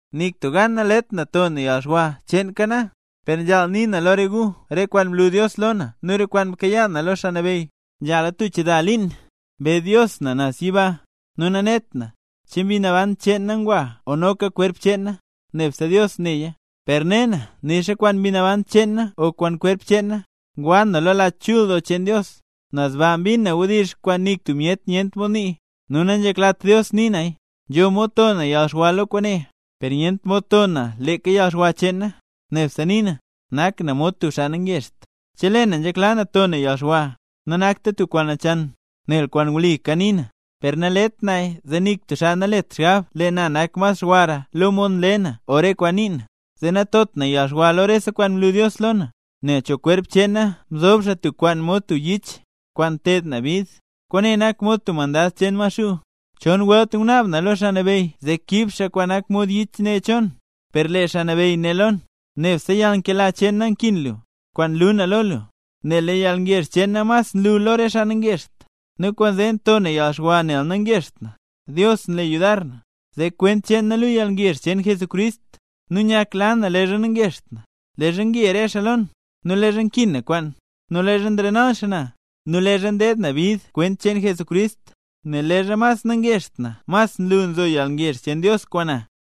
Nik tub gan nalet na to na yalxwa cheenka na, per nzhaal nii na lo re gu re kwaan mlu Dios lo na nu re kwaan mkayaa na lo Xaa Nabeyy. Nzhala tub chida liin mbe Dios na naz yiba. Nu nanet na, che mbi naban cheen na ngwa o noka kwerp cheen na, nebse Dios neya. Per ne na nixa kwaan mbi naban cheen na o kwaan xkwerp na, ngwa na Lach Chul Doo cheen Dios. Naz ba mbin na wdizh kwaan nik tub myet nyent mod nii, nu nanzheklat Dios nii naya. Nzho mod to na yalxwa lo kwaane, per nyent mod to na leeka yalxwa cheen na. Nebse nii na, nak na mod tub xaa nangezht. Chelee na nzhekla na to na yalxwa, nanakta tub kwaan nachan, nel kwaan wli kanii na. Per nalet naya zee nik tub xaa nalet xgab lee na nak mas xwara lo mod nle na o re kwaan nii na. Zee natot na yalxwa lo rese kwaan mlu Dios lo na, nel cho kwerp cheen na mzob xaa tub kwaan mod tub yich, kwaan nteed na bid, kwaane nak mod tub mandad cheen Maxuu. Chon welt ngunaab na lo Xaa Nabeyy zee kiib xaa kwaan nak mod yich ne cho na, per lee Xaa Nabeyy né lo na: “Nebse yalnkela cheen na nkin lu, kwaan nlu na lo lu, nel lee yalgezh cheen na mas nlu lo re xaa nangezht”. Nu kwaanzee nto na yalxwa nel nangezht na, Dios nle yudar na, zee kwent cheen na luu yalngezh cheen Jesucrist. Nu nyakla na leezha nangezht na, leezha nge re xaa lo na, nu leezha nkin na kwaan, nu leezha nrenal xaa na, nu leezha ndeed na bid kwent cheen Jesucrist; nel leezha mas nangezht na mas nlu nzo yalngezh cheen Dios kwaan na.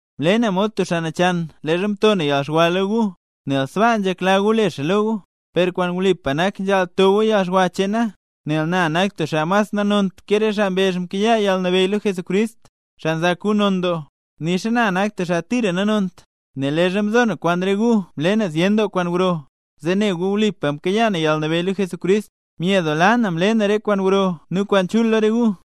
Mle na mod tub xaa nachan leezha mto na yalxwa lo gu, nel sbaa nzhekla gu le xaa lo gu, per kwaan wlipa nak nzhaal to gu yalxwa cheen na. Nel na nak tub xaa mas nanont ke re xaa kwaan mbezh mkayaa yalnabeyy lo Jesucrist, xaa nzak gu non doo; nixa na nak tub xaa tira nanont. Nel leezha mzo na kwaan re gu mle na zyen kwaan gro, zee ne gu wlipa mkayaa na yalnabeyy lo Jesucrist. Myedoola na mle na re kwaan gro nu kwaan chul lo re gu.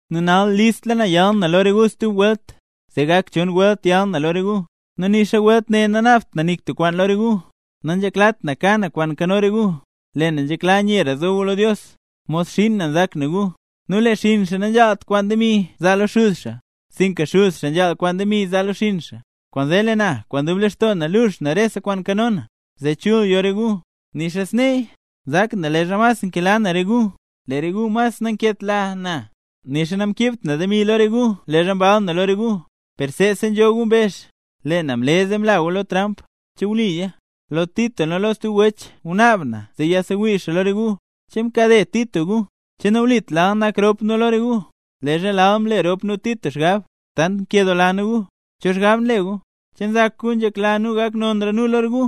Nu nal listla na yal na lo re gu stub welt, zee gak chon welt yal na lo re gu, nu nixa welt ne nanaabt na nik tub kwaan lo re gu. Nanzheklat na ka na kwaan nkano re gu, lee na nzhekla nyera zo gu lo Dios. Mod xiin na nzak na gu. Nu lee xinn xaa nanzhaalt kwaan demi zaa lo xuz xaa, sinka xuz xaa nzhaal kwaan demi zaa xaa lo xinn xaa. Kwaanzee lee na, kwaan dub lextoo na, lux na rese kwaan nkano na, zee chul yo re gu. Nixa sneeya, nzak na leezha mas nkela na re gu, lee re gu mas nanketla na. Nixa namkiibt na demi lo re gu leezha mbal na lo re gu; per seesa nzho gu mbezh, lee na mle zee mla gu lo tramp. ¿Che wliya? Lo Tito nu lo stub wech ngunaab na zee yasewii xaa lo re gu. ¿Che mkade Tito gu? ¿O che nawlit lal nak rop nu lo re gu, leezha lal mle rop nu Tito xgab? Tant nkedoola na gu. ¿Cho xgab nle gu? ¿Che nzak gu nzhekla nu gak nonra nu lo gu?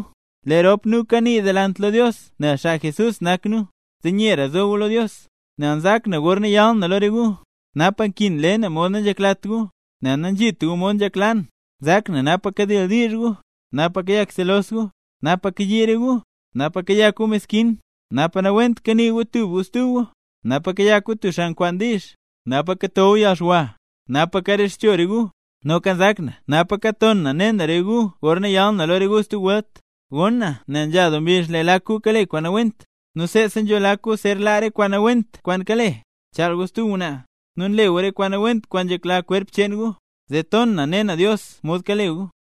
Lee rop nu kanii delant lo Dios nel xaa Jesús nak nu, zee nyera zo gu lo Dios. Nel nzak na gorna yal na lo re gu, napa nkin le na mod nanzheklat gu, nel nanzhit gu mod nzhekla na. Nzak na napa kadildiizh gu, napa kayak selos gu, napa kayii re gu, napa kayak gu meskin, napa nawent kanii gu tub gu stub gu, napa kayak gu tub xaa nkwaan diizh, napa kato gu yalxwa, napa karexcho re gu. Noka nzak na napaka nton na ne na re gu gorna yal na lo re gu stub welt, gonn na nel nzha doo mbizh lee lak gu kale kwaan nawent. Nu seesa nzho lak gu zer laa re kwaan nawent kwaan kale: nchaal gu stub ngwnaa, nu nle gu re kwaan nawent kwaan nzhekla kwerp cheen gu. Zee ton na ne na Dios mod kale gu.